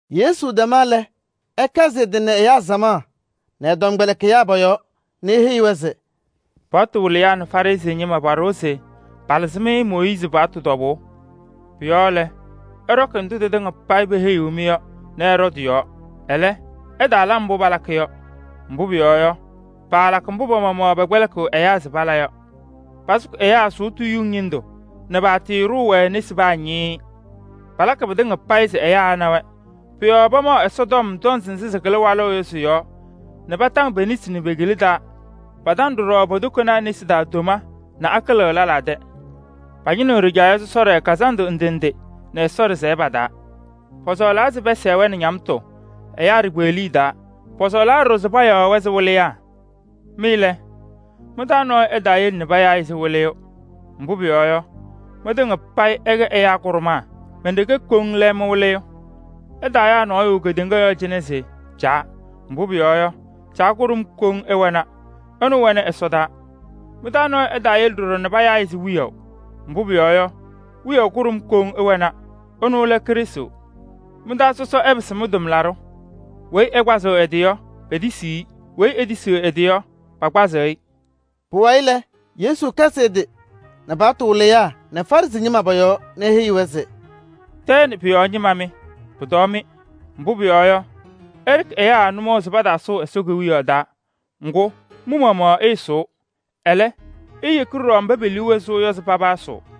Yesu tɛma lɛ, ɛkɛzɩ ɛ-tɩ nɛ ɛyaa samaɣ nɛ ɛ-tɔmkpɛlɩkɩyaa pɔ-yɔɔ nɛ eheyi-wɛ se: “Paɣtʋ wɩlɩyaa nɛ Farɩsɩ ñɩma paɖʋwa se palɩzɩ-mɩ Mooyiizi paɣtʋ tɔbʋʋ. Pʋ-yɔɔ lɛ, ɩɖɔkɩ ndʋ tɩtɩŋa payɩ peheyiɣ-mɩ yɔ nɛ ɩɖɔ tɩ-yɔɔ. Ɛlɛ, ɩtaala mbʋ palakɩ yɔ. Mbʋ pʋyɔɔ yɔ, paalakɩ mbʋ pa-maɣmaɣ pɛkpɛlɩkɩɣ ɛyaa se pala yɔ. Pasʋkɩ ɛyaa sʋʋtʋ yuŋ ñɩndʋ nɛ paatɩɩɖʋʋ-wɛ nesi paa ñɩɩɩ. Palakɩ pɩtɩŋa payɩ se ɛyaa ɛna-wɛ. Pʋ-yɔɔ pamaɣ Ɛsɔtɔm tɔnzɩ nzɩ sɩkɩlɩ walʋʋ yɔ sɩ-yɔɔ nɛ pataŋ pe-nesi nɛ pe-kila pa-taa. Pataŋaɣ ɖɔɖɔ po-tokonaa nesi taa tomee nɛ akɩlɩɣ lɛlaa tɛ. Pañɩnɩɣ ɖɩjaɣyɛ sɔsɔɖɛ kazandʋ ndɩ ndɩ nɛ Ɛsɔ ɖɩsɛyɛ pa-taa. Pɔsɔɔlaa se pɛsɛɣ-wɛ nɛ ñamtʋ ɛyaa ɖikpeɣliye taa. Pɔsɔɔlaa ɖɔɖɔ se payaɣ-wɛ se: ‘Wɩlɩyaa.’ Mɩ lɛ, mɩ-taa nɔɔyʋ ɛtaayele nɛ payaa-ɩ se: ‘Wɩlɩyʋ.’ Mbʋ pʋyɔɔ yɔ, mɩtɩŋa payɩ ɩkɛ ɛyaa kʋɖʋmaa, men-ɖeke koŋ lɛ mɩ-Wɩlɩyʋ. Ɩtaayaa nɔɔyʋ kedeŋa yɔɔ cɩnɛ se: ‘Caa.’ Mbʋ pʋyɔɔ yɔ, Caa kʋɖʋm koŋ ɩwɛna, ɛnʋ wɛnɩ ɛsɔdaa. Mɩ-taa nɔɔyʋ ɛtaayele ɖɔɖɔ nɛ payaa-ɩ se: ‘Wiyaʋ.’ Mbʋ pʋyɔɔ yɔ, Wiyaʋ kʋɖʋm koŋ ɩwɛna, ɛnʋ lɛ Krɩstʋ. Mɩ-taa sɔsɔ ɛpɩsɩ mɩ-tʋmlaɖʋ. Weyi ɛkpazɩɣ ɛ-tɩ yɔ, petisiɣ-i. Weyi ɛlɛ tisiɣ ɛ-tɩ yɔ, pakpazɩ-ɩ.” Pʋwayɩ lɛ, Yesu kɛzɩ ɛ-tɩ nɛ paɣtʋ wɩlɩyaa nɛ Farɩsɩ ñɩma pɔ-yɔɔ nɛ eheyi-wɛ se: “Tɛɛ nɛ pʋ-yɔɔ ñɩma mɩ, pʋtɔɔ-mɩ! Mbʋ pʋyɔɔ yɔ, ɩɖɩkɩ ɛyaa nʋmɔʋ se pataasʋʋ Ɛsɔ Kewiyaɣ taa. Ŋgʋ, mɩ-maɣmaɣ ɩɩsʋʋ, ɛlɛ, iiyeki ɖɔɖɔ mba pe-liu wɛ sʋʋ yɔ se paba ɛsʋʋ. [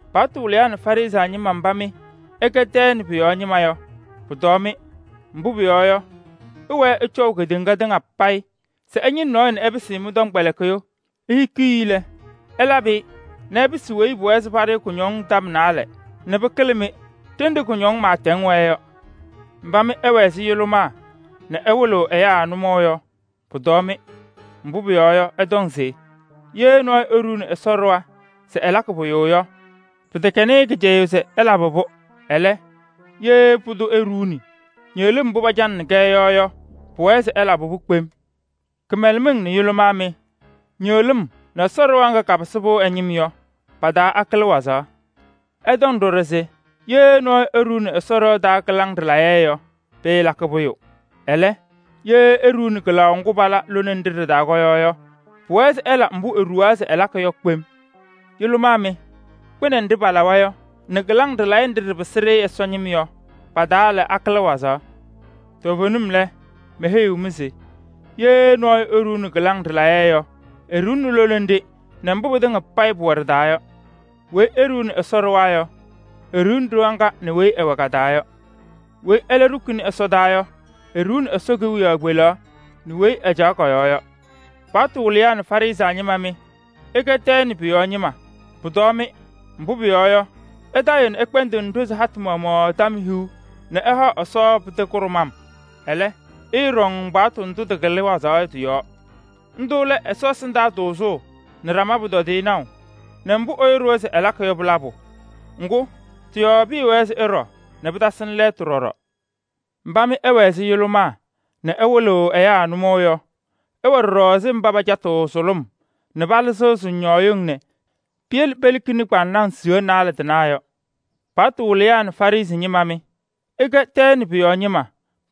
“Paɣtʋ wɩlɩyaa nɛ Farɩsɩ ñɩma mba mɩ ɩkɛ tɛɛ pʋ-yɔɔ ñɩma, pʋtɔɔ-mɩ! Mbʋ pʋyɔɔ yɔ, ɩwɛɛ ɩcɔʋ kedeŋa tɩŋa payɩ se ɩñɩnɩ nɔɔyʋ nɛ ɩpɩsɩ-ɩ mɩ-tɔmkpɛlɩkɩyʋ. Ihikiɣ-i lɛ, ɩlabɩ-ɩ nɛ ɛpɩsɩ weyi pʋwɛɛ se paɖʋ-ɩ kʋñɔŋ tɔm naalɛ nɛ pɩkɩlɩ-mɩ, ɖenɖe kʋñɔŋ pɩɩtɛŋ wɛɛ yɔ. “Mba mɩ ɩwɛ ɛzɩ yʋlʋmaa nɛ ɩwɩlɩɣ ɛyaa nʋmɔŋ yɔ, pʋtɔɔ-mɩ! Mbʋ pʋyɔɔ yɔ, ɩtɔŋ se: ‘Ye nɔɔyʋ eɖuuni Ɛsɔ ɖɩɣa se ɛlakɩ pʋyʋ yɔ, pɩtɛkɛnɩ-ɩ kɩcɛyʋʋ se ɛlabɩ-pʋ. Ɛlɛ, ye pʋdʋ eɖuuni ñɩɣlɩm mbʋ pacanɩnɩ-kɛ yɔ yɔ, pʋwɛɛ se ɛlabɩ-pʋ kpem.’ Kɩmɛlɛmɩŋ nɛ yʋlʋmaa mɩ! Ñɩɣlɩm nɛ Ɛsɔ ɖɩɣa ŋga kapɩsɩ-pʋ ɛ-ñɩm yɔ, pa-taa akɩlɩ wazaɣ? Ɩtɔŋ ɖɔɖɔ se: ‘Ye nɔɔyʋ eɖuuni Ɛsɔ ɖɩɣa taa kɩlaŋ ɖɩlayɛ yɔ, pɩɩlakɩ pʋyʋ. Ɛlɛ, ye eɖuuni kɩlaʋ ŋgʋ pala lone nɖɩ ɖɩ-taa yɔ yɔ, pʋwɛɛ se ɛla mbʋ eɖuwaa se ɛlakɩ yɔ kpem.’ Yʋlʋmaa mɩ! Kpɩnɛ nɖɩ palawa yɔ nɛ kɩlaŋ ɖɩlayɛ nɖɩ ɖɩpɩsɩ-ɖɩ Ɛsɔ ñɩm yɔ, pa-taa lɛ, akɩlɩ wazaɣ? Toovenim lɛ, meheyiɣ-mɩ se: ye nɔɔyʋ eɖuuni kɩlaŋ ɖɩlayɛ yɔ, eɖuuni lone nɖɩ nɛ mbʋ pɩtɩŋa payɩ pʋwɛ ɖɩ-taa yɔ. Weyi eɖuuni Ɛsɔ ɖɩɣa yɔ, eɖuuni ɖɩɣa ŋga nɛ weyi ɛwɛ ka-taa yɔ. Weyi ɛlɛ ɖukuni ɛsɔtɔnʋʋ yɔ, eɖuuni Ɛsɔ Kewiyaɣ kpelaɣ nɛ weyi ɛcaɣ kɔ-yɔɔ yɔ. “Paɣtʋ wɩlɩyaa nɛ Farɩsɩ ñɩma mɩ, ɩkɛ tɛɛ nɛ pʋ-yɔɔ ñɩma, pʋtɔɔ-mɩ! Mbʋ pʋyɔɔ yɔ, ɩtayɩɣ nɛ ɩkpɛndɩɣnɩ ɖozi hatʋ maɣmaɣ tɔm hiu nɛ ɩhaɣ Ɛsɔ pɩtɛ kʋɖʋmbʋ. Ɛlɛ, ɩɩɖɔŋ paɣtʋ ndʋ tɩkɩlɩ wazaɣ yɔ tɩ-yɔɔ. Ndʋ lɛ: Ɛsɔ ɛsɩndaa tʋʋzʋʋ nɛ ɖama pʋtɔdɩyɛ naʋ nɛ mbʋ ɛyʋ ɖʋwa se ɛlakɩ yɔ pɩ-labʋ. Ŋgʋ, tɩ-yɔɔ pɩɩwɛɛ se ɩɖɔ nɛ pɩtasɩnɩ lɛɛtʋ ɖɔɖɔ. Mba mɩ ɩwɛ ɛzɩ yʋlʋmaa nɛ ɩwɩlɩɣ ɛyaa nʋmɔʋ yɔ, ɩwɛ ɖɔɖɔ ɛzɩ mba pacatɩɣ sʋlʋm nɛ palɩzɩɣ sʋŋñɔɔyɩŋ nɛ piyele pelikini kʋyʋndʋʋ kpaŋnaŋ yɔ. “Paɣtʋ wɩlɩyaa nɛ Farɩsɩ ñɩma mɩ, ɩkɛ tɛɛ nɛ pʋ-yɔɔ ñɩma,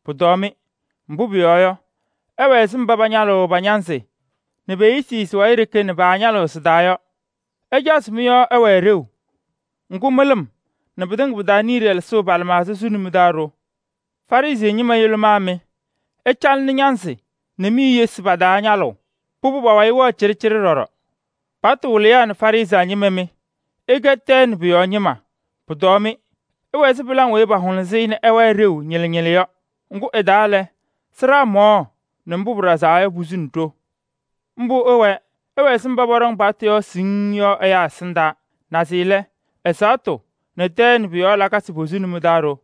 pʋtɔɔ-mɩ! Mbʋ pʋyɔɔ yɔ, ɩwɛ ɛzɩ mba pañalɩɣ pa-ñanzɩ nɛ pe-eyisi pa-wayɩ ɖeke nɛ paañalɩɣ sɩ-taa yɔ. Ɩcaɣ se mɩ-yɔɔ ɛwɛɛ ɖeu, ŋgʋ, mɩlɩm nɛ pɩtɩŋa pɩ-taa niye ɖɛlɛsʋʋ pa-lɩmaɣza suni mɩ-taa ɖo. Farɩsɩ ñɩma, yʋlʋmaa mɩ! Ɩcalɩnɩ mɩ-ñanzɩ nɛ mi-eyisi pa-taa ñalʋʋ, pʋbʋ pa-wayɩ wɛɣ cɩɖɩcɩɖɩ ɖɔɖɔ. “Paɣtʋ wɩlɩyaa nɛ Farɩsɩ ñɩma mɩ, ɩkɛ tɛɛ nɛ pʋ-yɔɔ ñɩma, pʋtɔɔ-mɩ! Ɩwɛ ɛzɩ pɩlaŋ weyi pahʋlʋsɩ-ɩ nɛ ɩwɛɛ ɖeu ñɩlɩ ñɩlɩ yɔ. Ŋgʋ ɩ-taa lɛ, sɩɖaa mɔɔ nɛ mbʋ pɩɖazaa yɔ, posuni ɖo. Mbʋ ɩwɛɛ: ɩwɛ ɛzɩ mba pɔɖɔŋ paɣtʋ yɔɔ siŋŋ yɔ ɛyaa ɛsɩndaa. Naze lɛ, ɛzaɣtʋ nɛ tɛɛ nɛ pʋ-yɔɔ lakasɩ posuni mɩ-taa ɖo.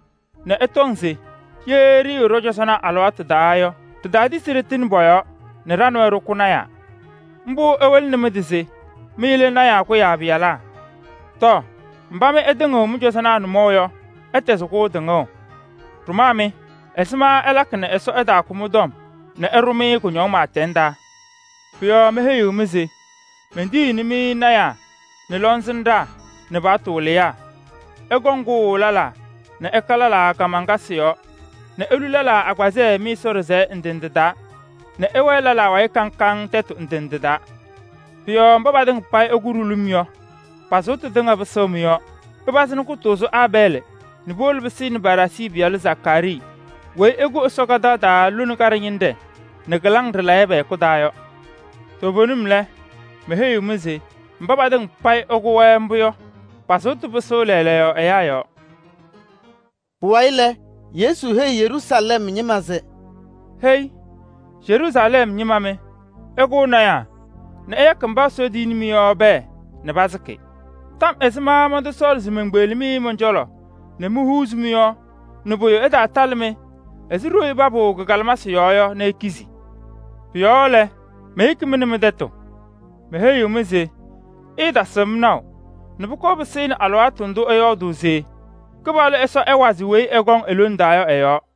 nɛ ɩtɔŋ se: ‘Ye ɖɩɩwɛ ɖɔ-cɔzɔnaa alɩwaatʋ taa yɔ, ɖitaatisi ɖɩtɩnɩ pɔ-yɔɔ nɛ ɖa nɛ wɛ ɖɩkʋ lɔɔyɩsɩ tɩnaa.’ Mbʋ ɩwɩlɩnɩ mɩ-tɩ se mɩ lɛ lɔɔyɩsɩ tɩnaa kʋyaa pɩyalaa. Tɔɔ! Mba mɩ ɩtɩŋɩɣ mɩ-cɔzɔnaa nʋmɔʋ yɔ, ɩtɛzɩ-kʋ tɩŋʋʋ! Ɖʋmaa mɩ! Ɛzɩma ɩlakɩ nɛ Ɛsɔ ɛtaakʋ mɩ-tɔm nɛ ɛɖʋ-mɩ kʋñɔŋ pɩɩtɛŋ taa? Pʋ-yɔɔ meheyiɣ-mɩ se: mentiyiɣni-mɩ lɔɔyɩsɩ tɩnaa nɛ lɔŋsɩnɖaa nɛ paɣtʋ wɩlɩyaa. Ɩkɔŋ kʋʋ lɛlaa nɛ ɩka lɛlaa kaamaŋkasɩ yɔɔ nɛ ilu lɛlaa agbazɛɛ mɩ-Ɛsɔ ɖɩsɛyɛ ndɩ ndɩ taa nɛ ɩwɛɛ lɛlaa wayɩ kaŋ kaŋ tɛtʋ ndɩ ndɩ taa. Pʋ-yɔɔ mba patɩŋa payɩ ɩkʋ-wɛ ɖulum yɔ, pa-sʋʋtʋ tɩŋa pɩsɩɣ mɩ-yɔɔ. Pɩpazɩɣnɩ kʋtʋʋzʋ Aabɛɛlɩ nɛ puwolo pɩsɩnɩ Baraacii pɩyalʋ Zakaarii weyi ɩkʋ Ɛsɔ ɖɩɣa kadaɣ taa lone kaɖɛ ñɩnɖɛ nɛ kɩlaŋ ɖɩlayɛ pɛ-hɛkʋ taa yɔ. Toovenim lɛ, meheyiɣ-mɩ se: mba patɩŋa payɩ pakʋ-wɛ mbʋ yɔ, pa-sʋʋtʋ pɩsɩɣ lɛɛlɛɛyɔ ɛyaa yɔɔ!” Pʋwayɩ lɛ, Yesu heyi Yeruusalɛm ñɩma se: “Hei! Yeruusalɛm ñɩma mɩ, ɩkʋʋ lɔɔyɩsɩ tɩnaa nɛ ɩyakɩ mba Ɛsɔ tiyini-mɩ yɔ pɛɛ nɛ pasɩkɩ. Tɔm ɛzɩma mɔntɔsɔɔlɩ se menkpeɣli-mɩ mɔn-cɔlɔ nɛ mohuuzi mɩ-yɔɔ nɛ pʋyʋ ɛtaalabɩ-mɩ ɛzɩ ɖoyuu papʋʋ kɩ-kalɩmasɩ yɔɔ yɔ nɛ ikizi? Pʋ-yɔɔ lɛ, meyeki-mɩ nɛ mɩ-tɛtʋ. Meheyiɣ-mɩ se: ɩɩtasɩɣ-m naʋ nɛ pʋkɔɔ pɩsɩnɩ alɩwaatʋ ndʋ ɩyɔɔdʋʋ se: ‘Kɩpaɣlʋ Ɛsɔ ɛwazɩ weyi ɛkɔŋ e-lone taa yɔ ɛ-yɔɔ’ yɔ.”